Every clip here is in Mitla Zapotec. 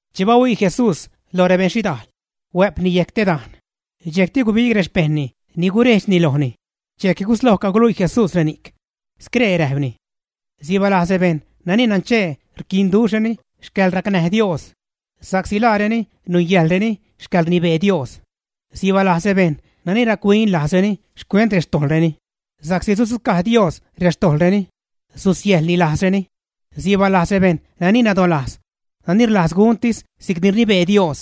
Che bahuii Jesús loj rebeṉ xhidajl, huä'pni yejc te dajn. Dxejcti gubig rexpejṉni ni gurejdxni lojni. Dxejc gusloj caguluii Jesús reni'c, scree räjpni: ―Sibaalajz rebejṉ nani nanchee rquinduxhreni xcäḻracnäj Dios, sa'csi laareni nungäjḻreni xcäḻrnibee Dios. ’Sibaalajz rebejṉ nani rac-huin lajzreni xcuent rextojḻreni, sa'csi sudzucaj Dios xtojḻreni, susiäjḻni lajzreni. ’Sibaalajz rebejṉ nani nadolajz nani rlajz guntis si'cni rnibee Dios,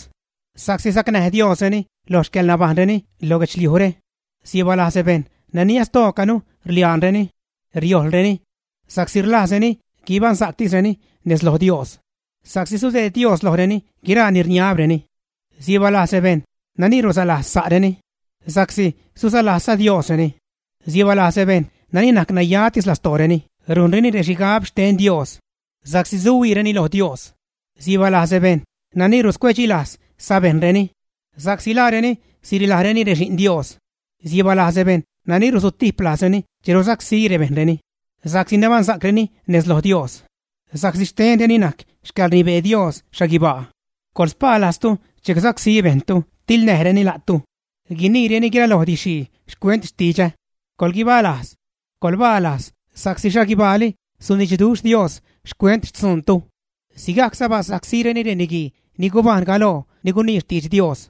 sa'csi sacnäj Diosreni lo xcäḻnabajṉreni lo guedxliujre. ’Sibaalajz rebejṉ ni nastoocanu rliaanreni, riojlreni, sa'csi rlajzreni guibaṉsa'ctisreni nez loj Dios, sa'csi sudeed Dios lojreni guiraa ni rniabreni. ’Sibaalajz rebejṉ nani rulaslajz sa'reni, sa'csi sulaslajzza Diosreni. ’Sibaalajz rebejṉ nani najc nayatis lastooreni rujnreni rexhigabsa'c xten Dios sa'csi suhuiireni lo Dios. ’Sibaalajz rebejṉ nani ruscuecdxilajz sabejṉreni, sa'csi laareni sirilajreni rexi'n Dios. ’Sibaalajz rebejṉ nani rusutijp lajzreni che rusacsí bejṉreni sa'csi nabaṉsa'creni nez loj Dios, sa'csi xtenreni najc xcäḻrnibee Dios xhaguibaa. ’Coḻspaalajztu che gusacsí bejṉtu tiḻnäjreni la'tu, guiniireni guiraloj didx-xhii xcuent xtidxä. Coḻguibaalajz, coḻbalajz sa'csi xhaguibaali sunidxduxh Dios xcuent xtzuuntu. Sigajcza basacsíreni reniguii ni gubajṉ galoo ni gunii xtidx Dios.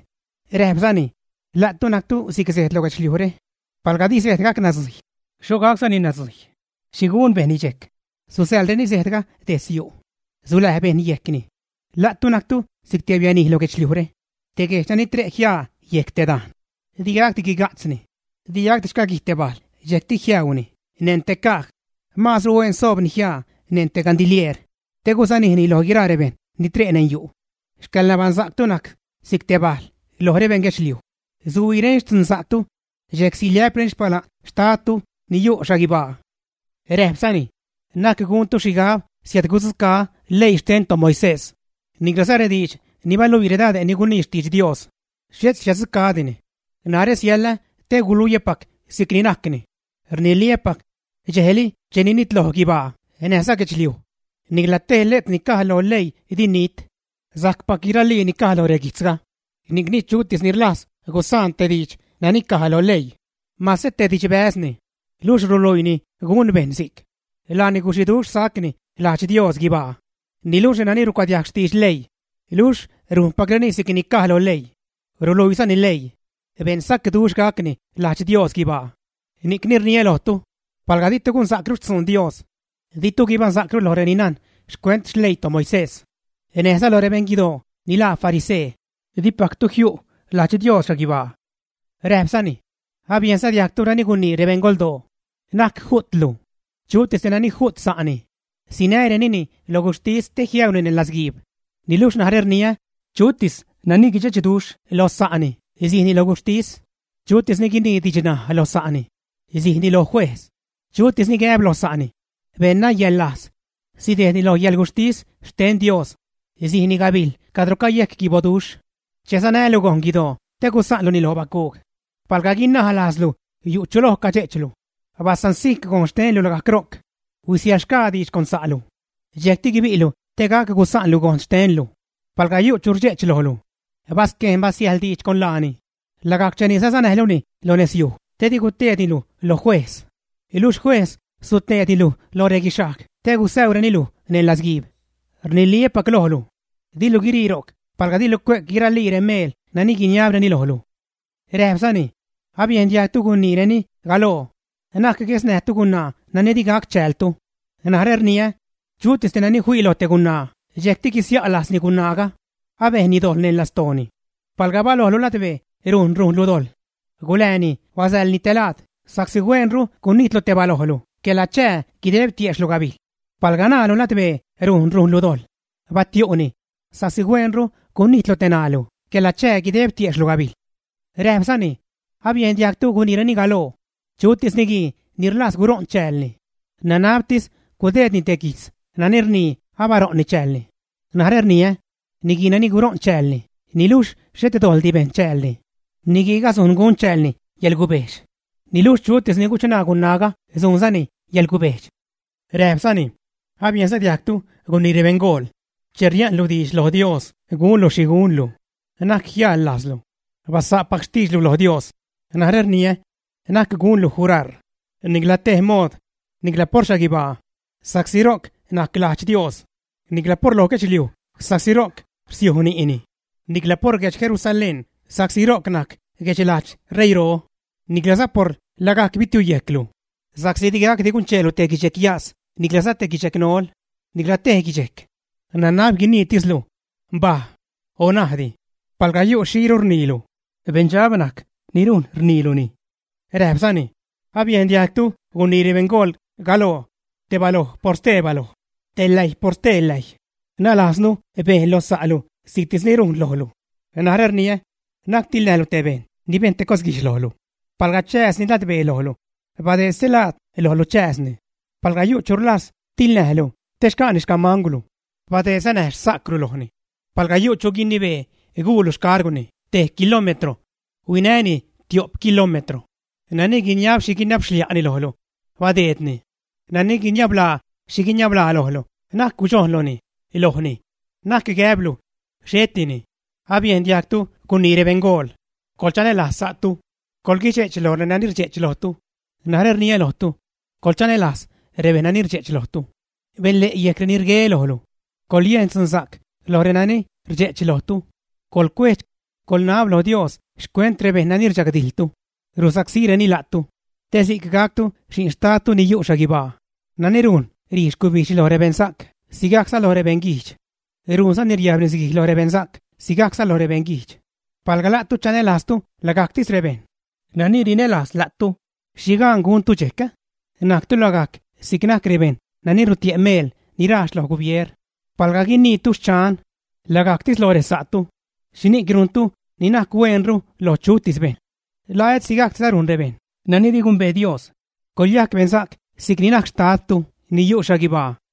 Räjpzani: ―La'tu najctu si'c sejd lo guedxliujre. Palga di sejd gac nadzujy, ¿xho gacsacni nadzujy? ¿Xhi gun bejṉni dxejc? Susäḻreni sejdga detz yu', suläj bejṉ yejcni. ’La'tu najctu si'c te bianij lo guedxliujre. Te guejdx nani tre' jiaa yejc te dajn, digacdi guiga'tzni. Digacdi xcaguij te bajl dxejcti jiäuuni neṉ te caj. Maazru huen soobni jiaa neṉ te gandilieer te gusänijni loj guiraa rebejṉ ni tre' neṉ yu'. Xcäḻnabaṉsa'ctu najc si'c te bajl loj rebeṉ guedxliuj. Suhuiireni xtzunsa'ctu dxejc siliä'preni xpala'n xtadtu ni yu' xhaguibaa. Räjpzani: ―Na'c guntu xhigab siädgudzucaä́ leii xten toMoisés, niclaza rediidx ni baluii redad ni gunii xtidx Dios. Xhet siäddzucaä́dini, narä siälä te guluiäpacni si'cni najcni. Rniliä́pac, dxejli che ni nitloj guibaa näjza guedxliuj, nicla tej letr ni caj loj leii di nit. Sajcpac guiralii ni caj lo reguijtzga. Ni'cni chutis ni rlajz gusaan te diidx nani caj loj leii, mase te didxbäzni, luxh ruluiini gun bejṉ si'c, laani guxiduxh sajcni lajdx Dios guibaa. Niluxh renani rucuadiajg xtidx leii, luxh rujnpacreni si'cni caj lo leii, ruluiizani leii, beṉsacduxh gacni lajdx Dios guibaa. Ni'cni rniä lojtu, palga ditu gunsa'cru xtzun Dios, ditu guibaṉsa'cru loj reni najn xcuent xleii toMoisés, näjza loj rebeṉ guidoo ni laa farisee, dipactu jiu' lajdx Dios xhaguibaa. Räjpzani: ―Abiejnza diajgtu nani gunii rebeṉgoldoo: “Na'c ju'tlu. Chutis te nani ju't sa'ni, sinärenini lo guxhtis te jiäuuni neṉ latzguiib.” Niluxh narä rniä chutis nani guidxechduxh lo sa'ni sijni lo guxhtis. Chutis ni guinii didxnaj lo sa'ni, sijni lo juejz. Chutis ni gäb lo sa'ni: “beṉnayäḻlajz” sidejdni loj yäḻguxhtis xten Dios, sijni gabijl cadro cayejc guiboduxh. ’Che sanälu gojn guidoo te gusa'nluni lo bacuug, palga guinaj lajzlu yu' chu lo cadxe'chlu, basansijc gojn xtenlu lagajc ro'c, huisiäḻxgaa diidx con sa'lu, dxejcti guibi'lu te gac gusa'nlu gojn xtenlu. ’Palga yu' chu rdxe'ch lojlu, basquejn basiäjḻ diidx con laani lagajc cheni sasanäjluni lonezyuj te di guteedni luj lo juejz. Luxh juejz suteedni luj loj reguixhajg te gusäureni luj neṉ latzguiib. Rniliä́pac lojlu: “Dilu guirii ro'c palga dilu cue'c guiralii meel nani guiniabni lojlu.” Räjpzani: ―Abiejn diajgtu guniireni galoo: “Na'c guesnäjtu gunaa nani di gac chäältu.” Narä rniä, chutis te nani fii loj te gunaa dxejcti guisia' lajzni gunaaga, abejnni dojḻ neṉ lastooni. Palga balojlu ladbee rujn rujnlu dojḻ, gulääni basäḻni te laad sa'csi hueenru gunijtlu te balojlu quela chää guideb tiejxhlu gabijl. Palga ṉaalu ladbee rujn rujnlu dojḻ, batiu'ni sa'csi hueenru gunijtlu te ṉaalu quela chää guideb tiejxhlu gabijl. Räjpzani: ―Abiejn diajgtu guniireni galoo: “Chutis niguii ni rlajz guṟo'n chäälni, nanabtis gudeedni te guijtz nani rnii abaṟo'nni chäälni.” Narä rniä, niguii nani guṟo'n chäälni niluxh xhet dojḻdi bejn chäälni, niguiiga sujn gun chäälni yäḻgubejxh, niluxh chutis ni guchṉaa gunaaga sujnzani yäḻgubejxh. Räjpzani: ―Abiejnza diajgtu gunii rebeṉgool: “Che ria'nlu diidx lo Dios gunlu xhi gunlu, na'c jial lajzlu; basa'pac xtiidxlu lo Dios.” Narä rniä, na'c gunlu juraar, nicla tej mood, nicla por xhaguibaa, sa'csi ro'c najc lajdx Dios, nicla por loj guedxliuj sa'csi ro'c rsiuj ni'ni; nicla por guedx Jerusalén sa'csi ro'c najc guedxlajdx ṟeiiro, niclaza por lagajc bitiuyejclu, sa'csi digacdi guncheelu te guichyas niclaza te guichnol, nicla tej guijch. Nanab guiniitislu: “Mbaj” o “Ajndi”. Palga yu' xhiru rniilu, beṉdxab najc ni rujn rniiluni. Räjpzani: ―Abiejn diajgtu gunii rebeṉgool galoo: “Te baloj por ste baloj, te läjy por ste läjy, nalajznu bejn lo sa'lu si'ctis ni rujnni lojlu.” Narä rniä, na'c tiḻnäjlu te bejṉ ni bejn te cos guijdx lojlu. Palga chääzni ladbee lojlu badeed stelaad lojlu chääzni. Palga yu' chu rlajz tiḻnäjlu te xca'ni xcamangwlu, badeedza näj xsa'cwlu lojni. Palga yu' chu guinibee guulu xcargwni te kilómetro, huinäni tio'p kilómetro. Nani guiniab xhi guiniabxlia'ni lojlu, badeedni. Nani guiniablaa xhi guinablaani lojlu na'c gudxojnluni lojni, na'c gäblu: “Xhetini.” ’Abiejn diajgtu gunii rebeṉgool: “Coḻchanälajz sa'tu. Coḻguidxe'ch loj renani rdxe'ch lojtu.” Narä rniä lojtu, coḻchanälajz rebejṉ ni rdxe'ch lojtu. Benle' yejc reni rgue lojlu. Coḻyejn dxunsa'c loj renani rdxe'ch lojtu. Coḻcuejdx, coḻnab loj Dios xcuent rebejṉ nani rdxagdijḻtu, rusacsíreni la'tu, te si'c gactu xi'n xtadtu ni yu' xhaguibaa nani rujn ṟii xcubijdxni lo rebeṉsa'c sigajcza lo rebeṉ guijdx. Rujnzani riajb nisguij lo rebeṉsa'c sigajcza lo rebeṉguijdx. Palga la'tu chanälajztu lagajctis rebejṉ nani rinälajz la'tu, ¿xhi gaan guntu dxejc? Najctu lagajc si'c najc rebejṉ ni rutie' meel ni rajx lo gubier. Palga guiniitu: “Xchan”, lagajctis loj resa'tu, ¿xhini'c rujntu ni najc hueenru lo chutis bejṉ? ¿La et sigajcdiza rujn rebejṉ nani di gumbee Dios? Coḻyajc beṉsa'c si'c ni najc xtadtu ni yu' xhaguibaa.